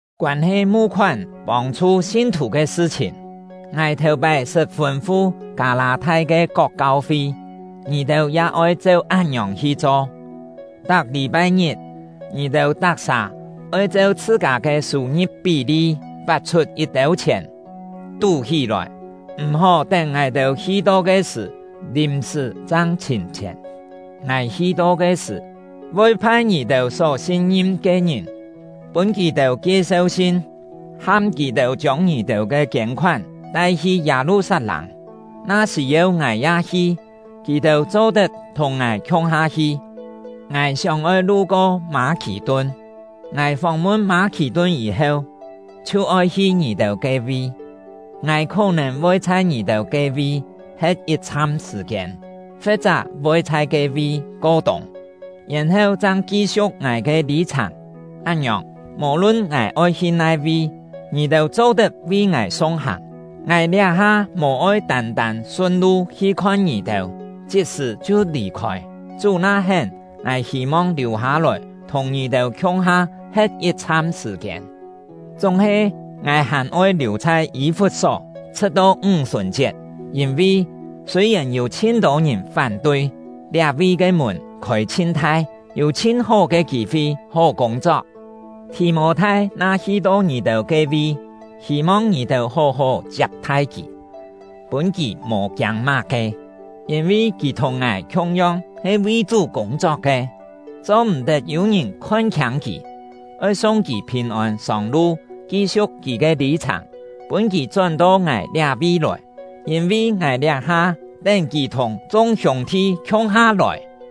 Koân-he mu-khoán pông-chhu sin-thù ke sṳ-chhìn, ngài thèu-pái sṳt fûn-fu Kâ-lâ-thai ke kok kau-fi, ngì-têu ya oi cheu án-ngiòng hi cho. Tak lî-pai-ngit, ngì-têu tak-sà oi cheu chhṳ-kâ ke sû-ngi̍p pí-li pat-chhut yit-têu chhièn, tú-hí-lòi, m̀-hó tén ngài hi-to ke sṳ̀ lìm-sṳ̀ chang chhìm chhièn. Ngài hi-to ke sṳ̀, voi phai ngì-têu só sin-ngim ke ngìn, pûn kì-têu kie-seu-sin, ham kì-têu chiông ngì-têu ke kiên-khoán tai-hi Yâ-lu-sat-lâng. Na sî-yeu ngài ya hi, kì-têu cho-tet thùng ngài khiung-ha hi. Ngài sióng-oi lu-ko Mâ-khì-tun. Ngài fóng-mun Mâ-khì-tun yî-heu, chhiu oi hi ngì-têu ke-vi. Ngài khó-nèn voi chhai ngì-têu ke-vi he̍t yit-chham sṳ̀-kiên, fe̍t-chá voi chhai ke-vi ko-tûng, yèn-heu chang ki-siu̍k ngài ke lî-chhàng. Án-ngiòng, mò-lun ngài oi hi nai-vi, ngì-têu cho-tet vi ngài sung-hàng. Ngài liá-ha mò-oi tân-tân sun-lu hi khon ngì-têu, chit-sṳ̀ chhiu lì-khôi; Chú na hén, ngài hî-mong liù-hâ-lòi thùng ngì-têu khiung-ha he̍t yit-chham sṳ̀-kiên. Chúng-he, ngài hàn oi liù chhai Yî-fut-só, chhṳ̍t-to Ńg-sùn-chiet; yîn-vi, sûi-yèn yû chhin-tô ngìn fán-tui, liá-vi ke mùn khôi chhin thai, yû chhin hó ke kî-fi hó kûng-chok. Thì-mô-thai na hi-to ngì-têu ke-vi, hî-mong ngì-têu hó-hó chiap-thai kì, pûn kì mò kiâng má-ke, yîn-vi kì thùng ngài khiung-yong he vi Chú kûng-chok ke. Cho-m̀-tet yû-ngìn khon-khiâng kì; oi sung kì phìn-ôn sông-lu ki-siu̍k kì ke lî-chhàng, pûn kì chón-to ngài liá-vi lòi, yîn-vi ngài liá-ha tén kì thùng chung hiûng-thi khiung-ha lòi.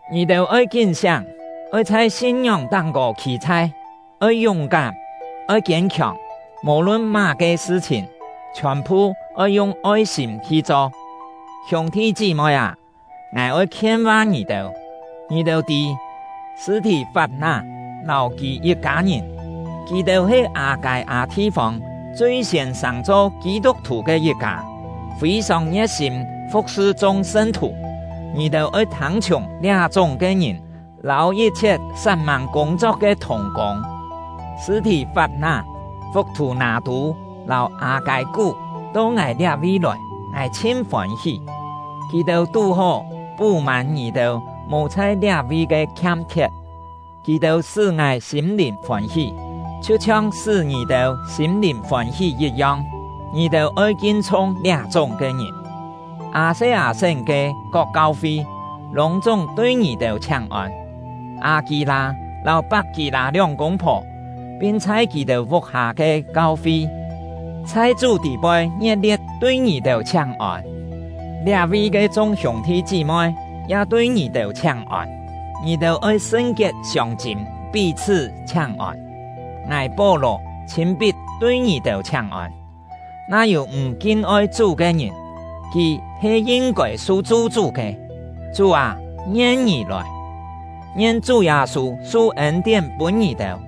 Ngì-têu oi kín-siáng, oi chhai sin-ngióng táng-kô khî-chhai, oi yúng-kám, oi kiên-khiòng. Mò-lun má-ke sṳ-chhìn, chhiòn-phu oi yung oi-sîm hi cho. Hiûng-thi chí-moi â, ngài oi khien-va ngì-têu. Ngì-têu tî Sṳ̂-thì-fap-ná lâu kì yit-kâ ngìn; kì-têu he Â-kâi-â thi-fông chui-siên sàng-cho Kî-tuk-thù ke yit-kâ, fî-sòng ngie̍t-sîm fu̍k-sṳ chung sṳn-thù. Ngì-têu oi thâng-chhiùng liá-chúng ke ngìn lâu yit-chhiet sat-mâng kûng-chok ke thùng-kûng. Sṳ̂-thì-fap-ná, Fuk-thù-nâ-tû, lâu Â-kâi-kú to ngài liá-vi lòi, ngài chhin fôn-hí. Kì-têu tú-hó pú-mân ngì-têu mò chhai liá-vi ke khiam-khiet. Kì-têu sṳ́ ngài sîm-lìn fôn-hí, chhiu-chhiong sṳ́ ngì-têu sîm-lìn fôn-hí yit-yong. Ngì-têu oi kin-chhung liá-chúng ke ngìn. Â-se-â-sén ke kok kau-fi lûng-chúng tui ngì-têu chhiáng-ôn; Â-kî-lâ lâu Pak-kî-lâ lióng kûng-phò, pin chhai kì-têu vuk-hâ ke kau-fi, chhai Chú tî-poi ngie̍t-lie̍t tui ngì-têu chhiáng-ôn. Liá-vi ke chung hiûng-thi chí-moi ya tui ngì-têu chhiáng-ôn. Ngì-têu oi sṳn-kiet siông-chîm pí-chhṳ́ chhiáng-ôn. Ngài — Pó-lò chhîn-pit tui ngì-têu chhiáng-ôn. Na yû m̀ kin-oi Chú ke ngìn, kì he yin-kôi su chu-chú ke. Chú â, ngien ngì lòi! Ngien Chú Yâ-sû su ên-tién pûn ngì-têu!